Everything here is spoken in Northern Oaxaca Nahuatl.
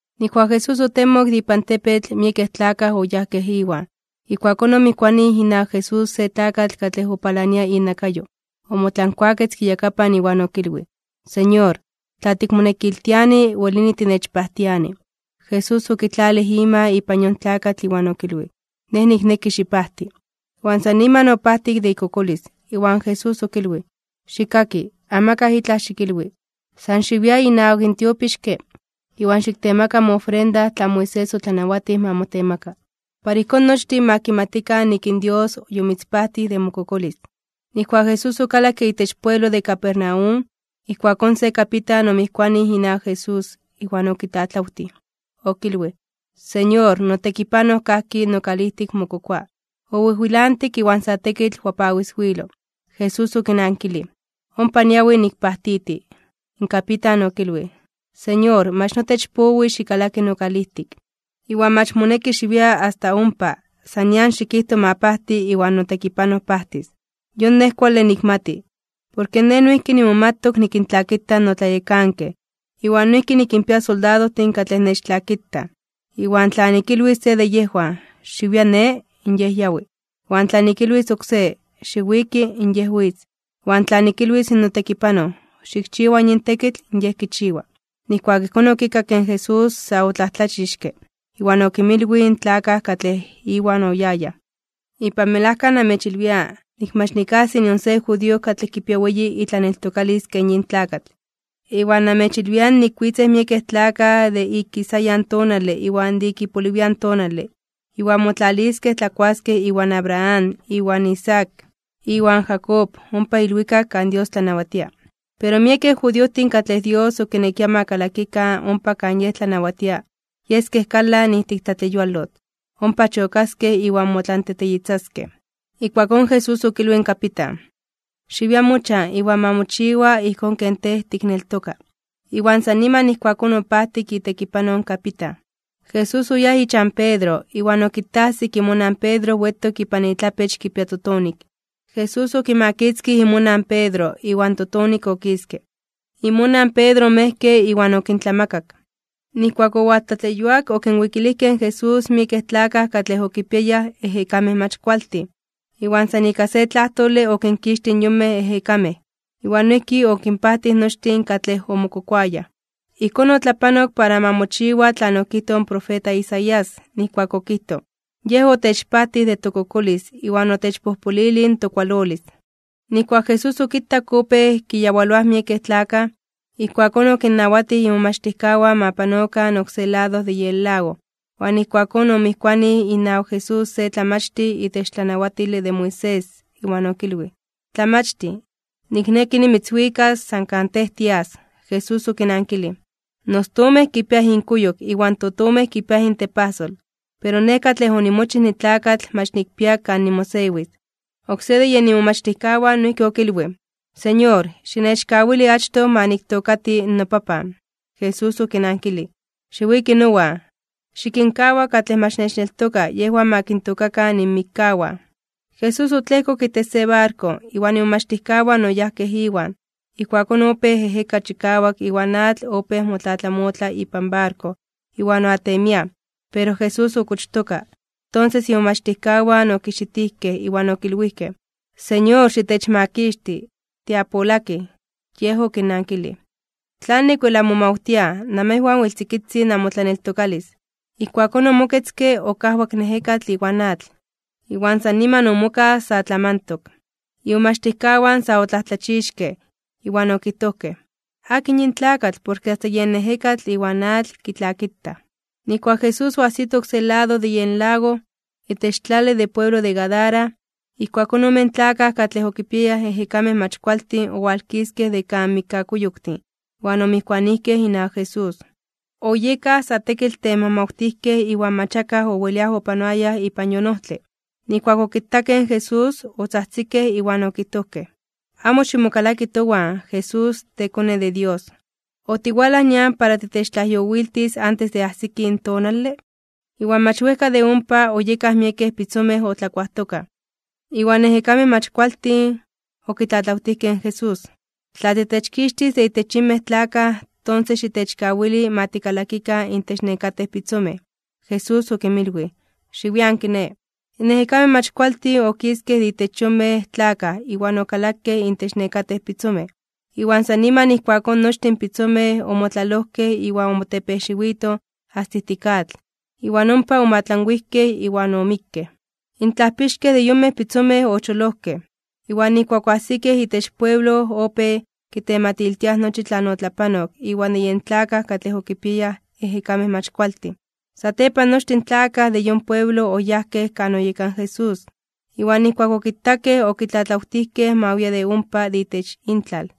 Nijkuak Jesús otemok de ipan tepetl, miekej tlakaj oyajkej Iwan. Ijkuakón omijkuanij inawak Jesús se tlakatl katlej opalania inakayo, omotlankuaketzke iyakapan iwan okilwij: ―Señor, tla tikmonekiltiani, welini tinechpajtiani. Jesús okitlalij ima ipan yon tlakatl iwan okilwij: ―Nej nikneki xipajti. Iwan san niman opajtik de ikokolis. Iwan Jesús okilwij: ―Xikkaki, amakaj itlaj xikilwi. San xiwia inawak in tiopixke, iwan xiktemaka moofrenda tlan Moisés otlanawatij ma motemaka, para ijkón nochtin ma kimatikan nik in Dios yomitzpajtij de mokokolis. Nijkuak Jesús okalakke itech pueblo de Capernaum, ijkuakón se kapitan omijkuanij inawak Jesús, iwan okitlatlawtij. Okilwij: ―Señor, notekipanoj kajki nokalijtik mokokoa, owijwilantik iwan sa tekitl wapawiswilo. Jesús okinankilij: ―Ompa niawi nikpajtiti. In kapitan okilwij: ―Señor, mach notech powi xikalaki nokalijtik. Iwan mach moneki xiwia asta ompa, san nian xikijto ma pajti iwan notekipanoj pajtis. Yon nej kuale nikmati. Porke nej noijki nimomatok nikintlakita notlayekankej. Iwan noijki nikinpia soldadojtin katlej nechtlakitaj. Iwan tla nikilwis se de yejwan: “Xiwia ne”, in yej yawi. Iwan tla nikilwis oksé: “Xiwiki”, in yej witz. Iwan tla nikilwis in notekipanoj: “Xikchiwa yin tekitl”, in yej kichiwa. Nijkuak ijkón okikakke in Jesús, sa otlajtlachixke (omomajmawtij), iwan okinmilwij in tlakaj katlej Iwan oyayaj: ―Ipan melajka namechilwia, nik mach nikajsi nion se judío katlej kipia weyi itlaneltokalis ken yin tlakatl. Iwan namechilwia nik witzej miekej tlakaj de ik ikisayan tonale iwan de ik ipoliwian tonale, iwan motlaliskej tlakuaskej iwan Abraham, iwan Isaac, iwan Jacob, ompa ilwikak kan Dios tlanawatia. Pero miekej judiojtin katlej Dios okinekia ma kalakikan ompa kan Yej tlanawatia, yeskej kalan ijtik tlatleyualotl. Ompa chokaskej iwan motlanteteyitzaskej. Ijkuakón Jesús okilwij in kapitan: ―Xiwia mochan, iwan ma mochiwa ijkón ken tej tikneltoka. Iwan san niman ijkuakón opajtik itekipanoj in kapitan. Jesús oyáj ichan Pedro, iwan okitajsik imonan in Pedro wetok ipan itlapech kipia totonik. Jesús okimakitzkij imonan in Pedro, iwan in totonik okiske. Imonan Pedro omejke iwan okintlamakak. Nijkuak owaltlatleyuak okinwikilijkej in Jesús miekej tlakaj katlej okipiayaj ejekamej mach kualtin. Iwan san ika se tlajtole okinkixtij in yonmej ejekamej, iwan noijki okinpajtij nochtin katlej omokokoayaj. Ijkón otlapanok para ma mochiwa tlan okijtoj in profeta Isaías, nijkuak okijtoj: “Yej otechpajtij de tokokolis iwan otechpojpolilij in tokualolis.” Nijkuak Jesús okitak opéj kiyawaloaj miekej tlakaj, ijkuakón okinnawatij imomachtijkawan ma panokan oksé lado de yen lago. Iwan ijkuakón omijkuanij inawak Jesús se tlamachtij itech tlanawatile de Moisés, iwan okilwij: ―Tlamachtij, nikneki nimitzwikas san kan Tej tias. Jesús okinankilij: ―In ostomej kipiaj inkuyok, iwan totomej kipiaj intepajsol, pero Nej katlej onimochij nitlakatl mach nikpia kan nimosewis. Oksé de yen imomachtijkawan noijki okilwij: ―Señor, xinechkawili achtoj ma niktookati nopapan. Jesús okinankilij: ―Xiwiki nowan, xikinkawa katlej mach nechneltokaj yejwan ma kintookakan inmikkawan. Jesús otlejkok itech se barko, iwan imomachtijkawan oyajkej Iwan. Ijkuakón opéj ejeka chikawak iwan atl opéj motlatlamotla ipan barko iwan oatemiaj. Pero Jesús okochtoka. Tonses imomachtijkawan okijxitijkej, iwan okilwijkej: ―¡Señor, xitechmakixti! ¡Tiapolakij! Yej okinnankilij: ―¿Tlanik wel anmomawtiaj? Namejwan wel tzikitzin namotlaneltokalis. Ijkuakón, omoketzke, okajwak in ejekatl iwan atl, iwan san niman omokaj sa tlamantok. Imomachtijkawan sa otlajtlachixkej (omomajmawtijkej). Iwan okijtojkej: ―¿Akin yin tlakatl, porke asta yen ejekatl iwan atl kitlakitaj? Nijkuak Jesús oajsito oksé lado de yen lago, itech tlale de pueblo de Gadara, ijkuakón omen tlakaj katlej okipiayaj ejekamej mach kualtin owalkiskej de kan mikkakuyoktin iwan omijkuanijkej inawak Jesús. Oyekaj sa tekitl temajmawtijkej iwan mach akaj owelia opanoaya ipan yon ojtle. Nijkuak okitakej in Jesús, otzajtzikej, iwan okijtojkej: ―¡Amo ximokalaki towan, Jesús, teKone de Dios! ¿Otiwalaj nian para titechtlajyowiltis antes de ajsiki in tonale? Iwan mach wejka de ompa, oyekaj miekej pitzomej otlakuajtokaj. Iwan ejekamej mach kualtin okitlatlawtijkej in Jesús: ―Tla titechkixtis de intech yinmej tlakaj, tonses xitechkawili ma tikalakikan intech nekatej pitzomej. Jesús okinmilwij: ―Xiwian kiné. In ejekamej mach kualtin okiskej de intech yonmej tlakaj iwan okalakej intech nekatej pitzomej. Iwan san niman ijkuakón nochtin in pitzomej omotlalojkej iwan omotepejxiwitoj asta ijtik atl, iwan ompa omoatlanwijkej iwan omikkej. In tlajpixkej de yonmej pitzomej ocholojkej. Iwan nijkuak oajsikej itech pueblo opéj kitematiltiaj nochi tlan otlapanok iwan de yen tlakaj katlej okipiayaj ejekamej mach kualtin. Satepan nochtin in tlakaj de yon pueblo oyajkej kan oyeka in Jesús, iwan nijkuak okitakej okitlatlawtijkej ma wia de ompa de itech intlal.